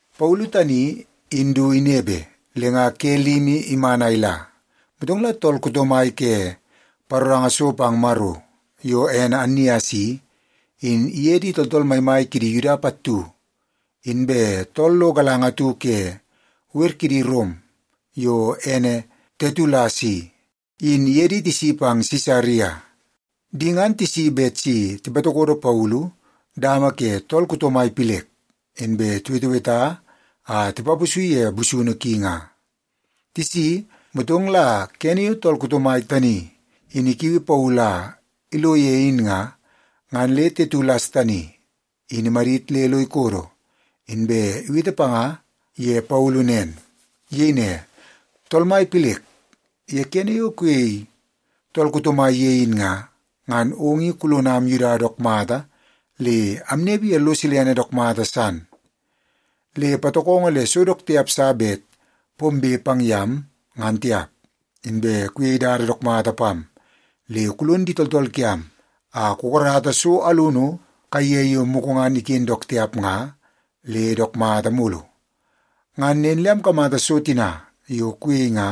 Paulu tani in du inepe, le nga ke limi iman a ila, motong la tool kuto mai ke paroranga so pang Maro yo ene Annias i, in iye di tooltool maimai kidi Yuda pattu, inbe tool lo galanga atu ke wer kidi Rom yo ene Tetulas i, in iye di tisi pang Sisaria. Di ngan tisi bet si tipatokodo Paulu dama ke tool kuto mai Pilek, inbe tiweteweta a tipaposi ye busunu ki nga. Tisi, motong la kene yo tool kuto mai tani in ikiui Paulu a ilo ye in nga, ngan le Tetulas tani in imadit le lo ikodo, inbe iwete panga ye Paulu nen. Iyei ne, “Tool mai Pilek, ye kene yo kuyei tool kuto mai ye in nga, ngan ong in kulonam Yuda dook mata le amnepe ye lo silene dook mata san, le patokongo le so dook tiap sa bet pombe pang yam, ngan tiap. Inbe kuyei dada dook mata pam, le kulon di tooltool kiam a kukarata so alunu kaiye yo mugu ngan iken dook tiap nga le dook mata mulu. Ngan nen le amkamata so tina yo kuyei nga,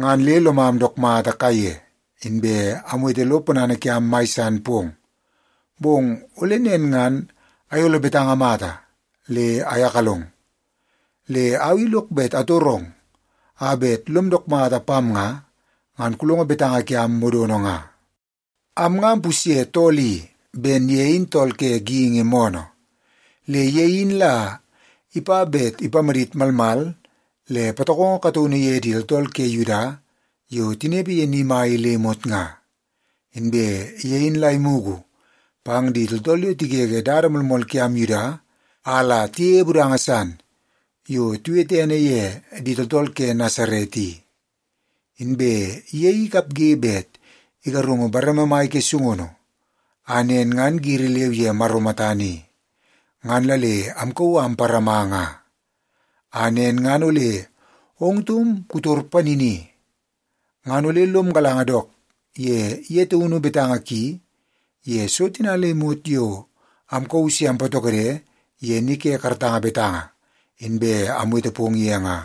ngan le lomam dook mata kaiye, inbe amwete lo ponana kiam mai san pong. Bong ole nen ngan ayolo betanga mata le ayakalong. Le au i lok bet atorong a bet lom dook mata pam nga, ngan kulongo betanga kiam modono nga. “Am nga ampusye tool i ben ye in tool ke geingi moonoo. Le ye in la ipa bet ipamadit malmal le patokongo kataunu ye di tooltool ke Yuda yo tinepe ye ni mai i le imot nga. Inbe ye in la imugu pang di tooltool yo tigege dada moolmool kiam Yuda a la tiyeie budanga san yo tiwete ene ye di Tooltool ke Nasaret i. Inbe ye in ikapge bet igarungu bareme mai ke sungunu, a nen ngan giri leu ye Maro matana i, ngan la le amkauu a amparama nga. A nen ngan ole ong taum kutor panini, ngan ole lom galanga dook ye ye taunu betanga ki ye so tina le imot yo amkauu se ampatokode ye ni ke karatanga betanga, inbe awete pong ye nga.”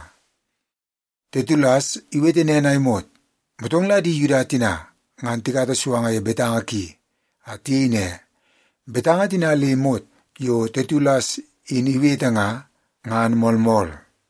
Tetulas iwete nen a imot, motong la di Yuda tina ngan tikata suanga ye betanga ki a tiyei ne, “Betanga tina le imot yo Tetulas in iwete nga, ngan moolmool.”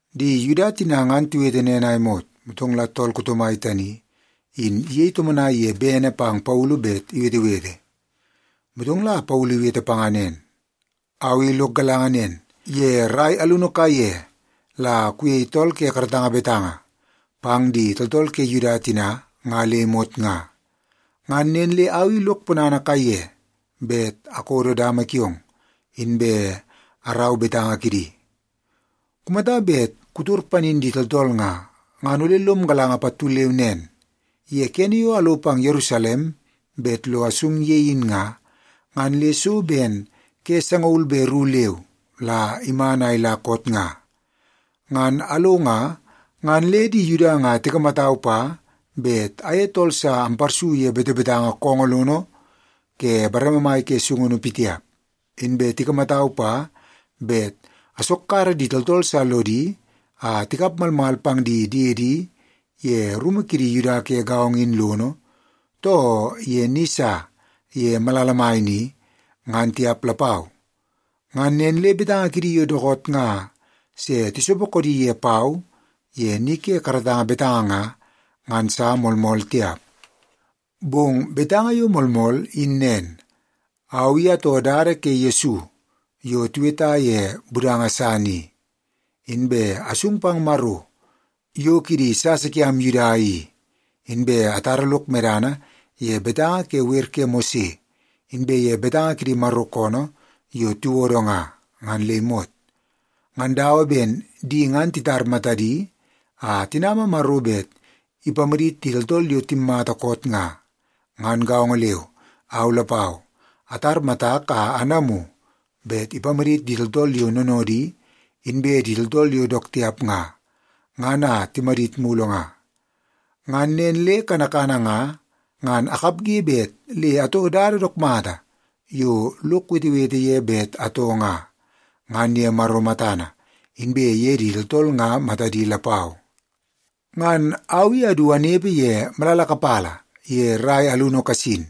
Di Yuda tina ngan tiwete nen a imot, motong la tool kuto mai tani in iyei tomonai ye bene pang Paulu bet iwetewete. Motong la Paulu iwete panga nen, “Au i lok galanga nen, ye rai alunu kaiye la kuyei tool ke karatanga betanga pang di tooltool ke Yuda tina nga le imot nga. Ngan nen le au i lok ponana kaiye bet akodo dama kiong, inbe arau betanga kidi. Kumata bet kutor panin di tooltool nga, ngan ole lom galanga pattu leu nen. Ye kene yo alo pang Yerusalem bet lo asung ye in nga, ngan le so ben ke sangaul be ru leu la iman a ila koot nga. Ngan alo nga, ngan le di Yuda nga tikamatau pa bet aye tool sa amparsu ye betebetanga koongoo lono ke bareme mai ke sungunu pitiap. Inbe tikamatau pa bet asokkara di tooltool sa lodi a tikap malmal pang di diedi ye rumu kidi Yuda ke gaongo in lono, too ye ni sa ye malala mai ni, ngan tiap lapau. Ngan nen le betanga kidi yo dookoot nga se tisopo koodi ye pau ye ni ke karatanga betanga nga, ngan sa moolmool tiap. Bong betanga yo moolmool in nen. Au i atoo Dada ke Yesu yo tiweta ye budanga san i. Inbe asung pang Maro yo kidi sasa kiam Yuda i, inbe atara lok medana ye betanga ke wer ke Mose, inbe ye betanga kidi Maro koonoo yo tiwodo nga, ngan le imot. Ngan dawa ben di ngan titar matadi a tinama Maro bet ipamadit di tooltool yo timmata koot nga, ngan gaongo leu, au lapau atar matak a anamu bet ipamadit di tooltool yo noonoodi inbe di tooltool yo dook tiap nga, ngan a timadit mulu nga. Ngan nen le kanakana nga, ngan akapge bet le atoo dada dook mata yo lok wetewete ye bet atoo nga, ngan ye Maro matana, inbe ye di tooltool nga matadi lapau. “Ngan au i adu anepe ye malala kapala ye rai alunu kasin,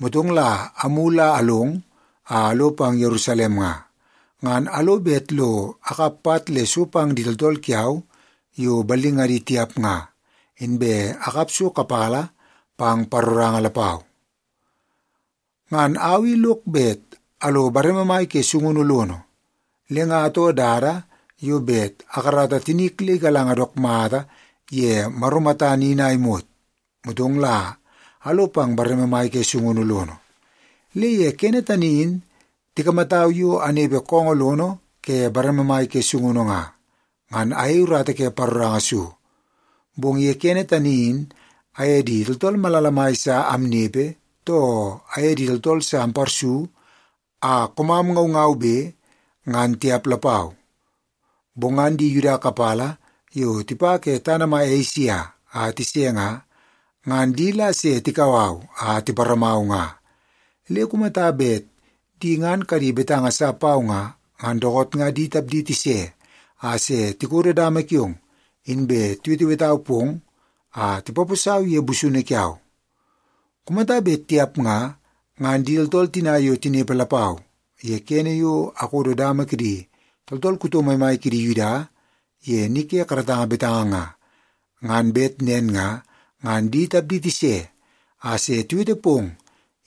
motong la amulu a along a alo pang Yerusalem nga, ngan alo bet lo akap pat le so pang di tooltool kiau yo ballingadi tiap nga, inbe akap so kapala pang paroranga lapau. Ngan au i lok bet alo bareme mai ke sungunu lono, le nga atoo dada yo bet akarata tinik le igalanga dook mata ye Maro matana in a imot, motong la alo pang bareme mai ke sungunu lono. Le ye kene tani in tikamatau yo anepe koongoo lono ke bareme mai ke sungunu nga, ngan ayei urata ke paroranga so. Bong ye kene tani in aye di tooltool malala mai sa amnepe, too aye di tooltool sa amparsu a koomam ngaungaube, ngan tiap lapau. Bong ngan di Yuda kapala yo tipa ke tana mai Esia a tise nga, ngan di la se tikau au a tiparamau nga. Le kumata bet di ngan kadi betanga sa pau nga, ngan dookoot nga di tapdi tise a se tikodo dama kiong, inbe tiwetewetau pong a tipaposau ye busunu kiau. Kumata bet tiap nga, ngan di tooltool tina yo tinepe lapau ye kene yo akodo dama kidi tooltool kuto maimai kidi Yuda ye ni ke karatanga betanga nga, ngan bet nen nga, ngan di tapdi tise a se tiwete pong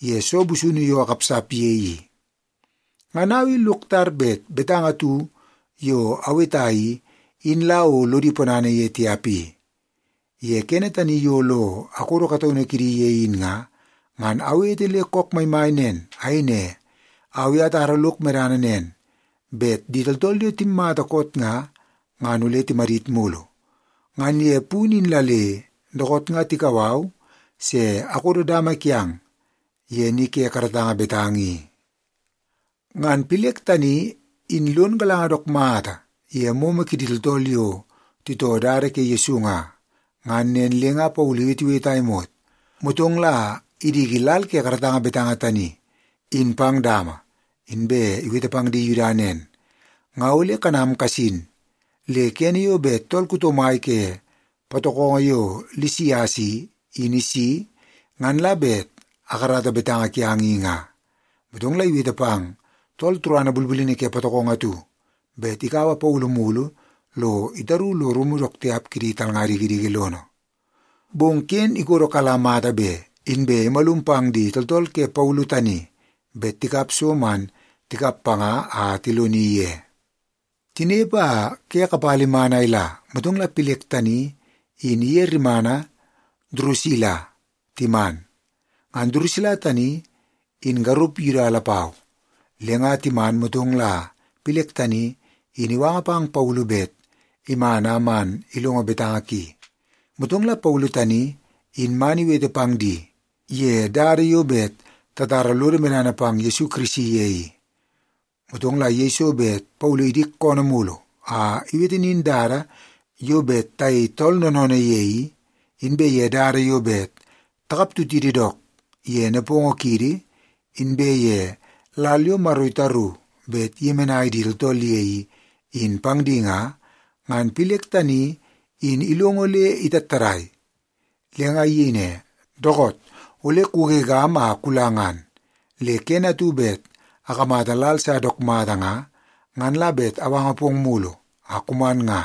ye soo busunu yo akapsap ye i. Ngan au i lok tar bet betanga atu yo aweta i, in la o lodi ponana ye tiap i. Ye kene tani yo lo akodo kataunu kidi ye in nga, ngan awete le kook maimai nen. Ayei ne, ‘Au i atara lok medana nen, bet di tooltool yo timmata koot nga, ngan ole timadit mulu. Ngan ye punu in la le dookoot nga tikau au se akodo dama kiang ye ni ke karatanga betanga i.’” Ngan Pilek tani in lon galanga dook mata ye moomoo kidi tooltool yo titoo Dada ke Yesu nga. Ngan nen le nga Paulu iwetewete a imot, motong la idiki lal ke karatanga betanga tani in pang dama, inbe iwete pang di Yuda nen, “Nga ole kanam kasin, le kene yo bet tool kuto mai ke patokongo yo Lisias i, in isi, ngan la bet akarata betanga kiang i nga.” Motong la iwete pang tool turana bulbulini ke patokongo atu bet ikaua Paulu mulu lo itaru lo rumu dook tiap kidi talnga dikidiki lono. Bong ken ikodo kala mata be, inbe imalum pang di tooltool ke Paulu tani bet tikap so man tikap panga a tiloni ye. Tinepe a ke kapala iman a ila, motong la Pilek tani in iye rimana Durusila timan. Ngan Durusila tani in garup Yuda lapau. Le nga timan, motong la Pilek tani in iwanga pang Paulu bet iman a man ilongo betanga ki. Motong la Paulu tani in man iwete pang di ye dada yo bet tatara lodo medana pang Yesu Kirisi ye i. Motong la yeiso bet Paulu idik koonoo mulu a iwete nin dada yo bet tayei tool noonoonoo ye i, inbe ye dada yo bet takaptutidi dook ye nepongo kiidi, inbe ye lal yo Maro itaru bet iyemenai di tooltool ye i, in pang di nga, ngan Pilek tani in ilongo le itattadai. Le nga iyei ne, “Dookoot! Ole kugegam a kula ngan. Le kene atu bet akamata lal sa dook mata nga, ngan la bet awanga pong mulu a kuman nga.”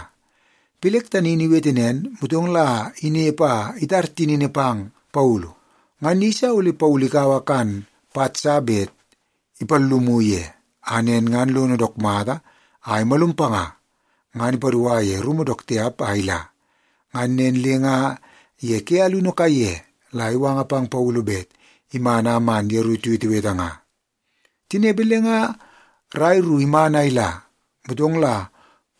Pilek tani in iwete nen, motong la inepe a itar tinini pang Paulu. Ngan iyeisa ole Paulu ikaua kan pat sa bet ipallumu ye, a nen ngan lono dook mata a imalum panga, ngan ipadua ye rumu dook tiap a ila. Ngan nen le nga ye ke alunu kaiye la iwanga pang Paulu bet iman a man yeru tiwetewete nga. Tinepe le nga rai ru iman a ila, motong la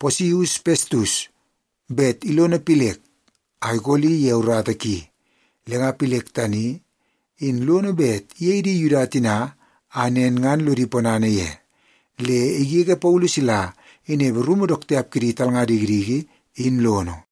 Posius Pestus bet ilono Pilek a ikoli ye urata ki. Le nga Pilek tani in lono bet iyei di Yuda tina a nen ngan lodi ponana ye, le igege Paulu sila inepe rumu dook tiap kidi talnga dikidiki in lono.